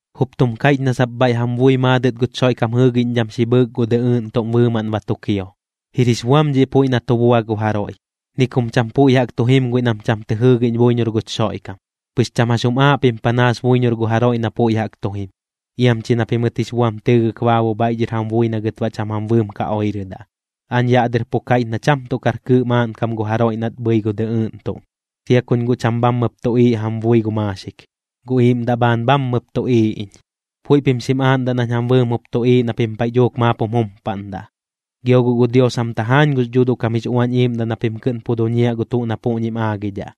Jup tum kaiꞌch na sap bhaiꞌ jam bui maadɨt guch Xoiꞌkam jɨɨgiꞌñdham xi bhɨɨk gu dɨꞌɨɨꞌn tuꞌm bɨɨmaꞌn ba tu kio. Jir jix buam dhiꞌ puiꞌ na tu bua gu jaroiꞌ, ni kum cham puiꞌ jaꞌk tu jim guiꞌ nam cham tɨ jɨɨgiꞌñ buiñor guch Xoiꞌkam. Pɨx cham jax jum aaꞌ pim panaas buiñor gu jaroiꞌ na puiꞌ jaꞌk tu jim, iam chi na pimɨt jix buam tɨɨgɨk baabu bhaiꞌ dhɨr jam bui na gɨt baꞌ cham jam bɨɨm ka oirɨdaꞌ. Aañ yaꞌ dɨr pu kaiꞌch na cham tuꞌ kar kɨɨꞌ maaꞌnkam gu jaroiꞌ nat bhɨi gu dɨꞌɨɨꞌn tuꞌm. Sia kuñ guꞌ cham bhammɨp tuꞌiiꞌ jam bui gu maaxik, gu iiꞌmdaꞌ bhaan bhammɨp tuꞌiiꞌ iñ. Puiꞌ pim xim aaꞌndaꞌ nañ jam bɨɨm jup tuꞌiiꞌ na pim paiꞌ dhuuk maap jum jumpaꞌndaꞌ. Gio guꞌ gu Dios jam tajaañ gux Dhuuduꞌ kam jix Uañ Iiꞌmdaꞌ na pim kɨꞌn pu duñiaꞌ gu tuꞌ na puꞌñim aagidhaꞌ,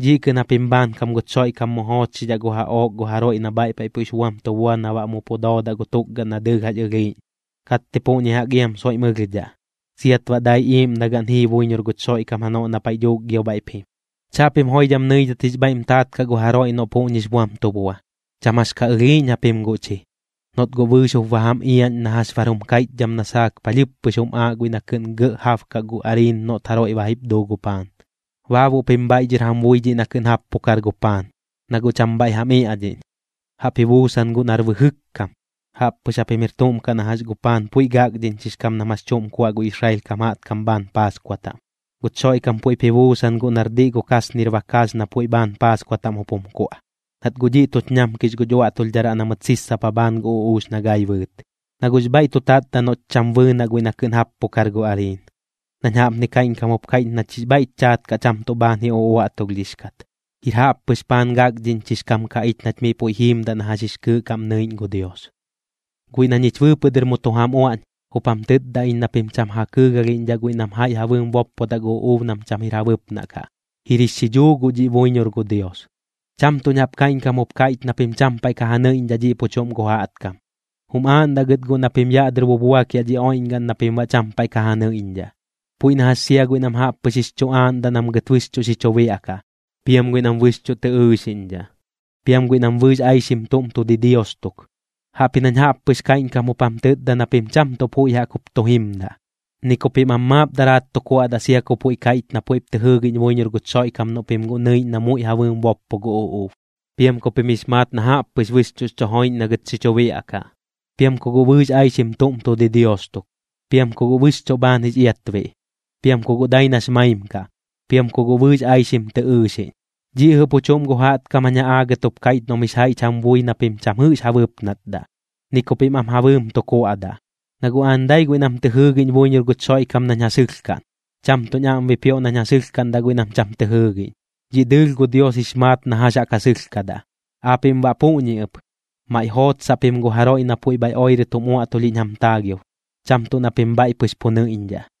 dhiꞌ kɨꞌn japim bhaankam guch Xoiꞌkam mu joochxidhaꞌ gu jaꞌook gu jaroiꞌ na bhaiꞌ paiꞌ puiꞌx buam tu bua na baꞌ mu pu doodaꞌ gu tukgaꞌn na dɨɨlh jax ɨlhiiꞌñ, katti puꞌñi jaꞌk iam soiꞌm ɨlhdhaꞌ, siat baꞌ dai iiꞌmdagaꞌn jii buiñor guch Xoiꞌkam janoꞌ na paiꞌ dhuuk gio bhaiꞌp jim. Chaꞌpim joidham nɨidhat jix bhaiꞌm taat kaꞌ gu jaroiꞌ noꞌ puꞌñix buam tu bua. Cham jax ka ɨlhiiꞌñ japim guꞌ chi, noꞌt guꞌ bɨɨx jup ba jam iaꞌñ na jax bar jum kaiꞌchdham na saak palhɨɨp pɨx jum aaꞌ guiꞌ na kɨꞌn gɇꞌ jabkaꞌ gu ariin noꞌt jaroiꞌ ba jip duu gu paan. Baabuꞌ pim bhaiꞌ dhɨr jam bui dhiꞌ na kɨꞌn jappukar gu paan, na guꞌ cham bhaiꞌ jam iaꞌdhiꞌñ, jaꞌp ji buusan guiꞌ nar bɨjɨk kam. Jaꞌppɨx japim jir tuꞌm kaꞌ na jax gu paan puiꞌ gakdhiꞌñchix kam nam jax chuꞌm kuaꞌ gu Israel kam jaꞌtkam bhaan Paaskua taꞌm. Guch Xoiꞌkam puiꞌp ji buusan guꞌ nar diꞌ gu kasnir bakaax na puiꞌ bhaan Paaskua taꞌm jup jum kuaꞌ, nat guꞌ dhiꞌ tuch ñamkix guch uaꞌtulhdharaꞌ na mɨt sissapa bhaan gu uꞌuux na gai bɨɨt. Na guꞌx bhaiꞌ tu tatdaꞌ noꞌch cham bɨɨnaꞌ guiꞌ na kɨꞌn jappukar gu ariin, nañ jaꞌpni kaiꞌñkam jup kaiꞌch nach jix bhaiꞌch chaat kaꞌ cham tuꞌ kɨꞌn bhaan ji uꞌuaꞌtulhdhix kat. Jir jaꞌppɨx paan gakdhiꞌñchix kam kaꞌ ich nach miꞌ puiꞌ jiimdaꞌ na jax jix kɨɨꞌ kaꞌm nɨiꞌñ gu Dios. Guiꞌ na ñich bɨɨpɨꞌ dɨr mu tu jam uaꞌñ, jup jam tɨtda iñ na pim cham ja kɨɨgalhiꞌñdhaꞌ guiꞌ nam jaiꞌ ja bɨɨm boppodaꞌ gu uꞌuub nam cham jir ja bɨpnaꞌ kaꞌ, jir jix xidhuu guꞌ dhiꞌ buiñor gu Dios. Cham tuꞌñ jaꞌp kaiꞌñkam jup kaiꞌch na pim cham paiꞌ ka ja nɨiꞌñdhaꞌ dhiꞌ pu chuꞌm gu jaꞌtkam. Jum aaꞌndaꞌ gɨt guꞌ na pim yaꞌ dɨr bubuakiaꞌ dhi oiꞌñgaꞌn na pim baꞌ cham paiꞌ ka ja nɨiꞌñdhaꞌ, puiꞌ na jax sia guiꞌ nam jaꞌp pɨx jix chu aaꞌndaꞌ nam gɨt bɨxchuꞌ xi chu biaꞌkaꞌ, piam guiꞌ nam bɨxchuꞌ tɨ ɨɨxiꞌñdhaꞌ, piam guiꞌ nam bɨɨx aixim tuꞌm tu didios tuk. Jaꞌpji nañ jaꞌp pɨx kaiꞌñkam jup jam tɨtda na pim cham tuꞌ puiꞌ jaꞌk jup tu jimdaꞌ, ni ku pim am maap daraat tu kuaꞌdaꞌ sia ku puiꞌ kaiꞌch na puiꞌp tɨ jɨɨgiꞌñ buiñor guch Xoiꞌkam noꞌ pim guꞌ nɨiꞌñ na muiꞌ ja bɨɨm boppo gu uꞌuub, piam ku pim jix maat na jaꞌp pɨx bɨxchuꞌx chu joiꞌñ na gɨt xi chu biaꞌkaꞌ, piam ku guꞌ bɨɨx aixim tuꞌm tu didios tuk, piam ku guꞌ bɨxchuꞌ bhaan jix iatbiꞌ, piam ku guꞌ dai nax maim kaꞌ, piam ku guꞌ bɨɨx aixim tɨ ɨɨxiꞌñ. Dhiꞌ jɨꞌ pu chuꞌm gu jaꞌtkam jañ ja aagɨt jup kaiꞌch noꞌm jix jaiꞌch jam bui na pim cham jɨꞌx ja bɨpnatdaꞌ, ni ku pim am ja bɨɨm tu kuaꞌdaꞌ. Na guꞌ aañ dai guiꞌ nam tɨ jɨɨgiꞌñ buiñor guch Xoiꞌkam nañ ja sɨlhkaꞌn, cham tuꞌñ aꞌm bipioꞌ nañ ja sɨlhkaꞌndaꞌ guiꞌ nam cham tɨ jɨɨgiꞌñ, dhiꞌ dɨɨlh gu Dios jix maat na jax jaꞌk ja sɨlhkadaꞌ. Aapiꞌm baꞌ puꞌñi ɨp, maiꞌ jootsaꞌ pim gu jaroiꞌ na puiꞌ bhaiꞌ oirɨt jum uaꞌtulhiꞌñ jam taagiob, cham tuꞌ na pim bhaiꞌ pɨx pu nɨiꞌñdhaꞌ.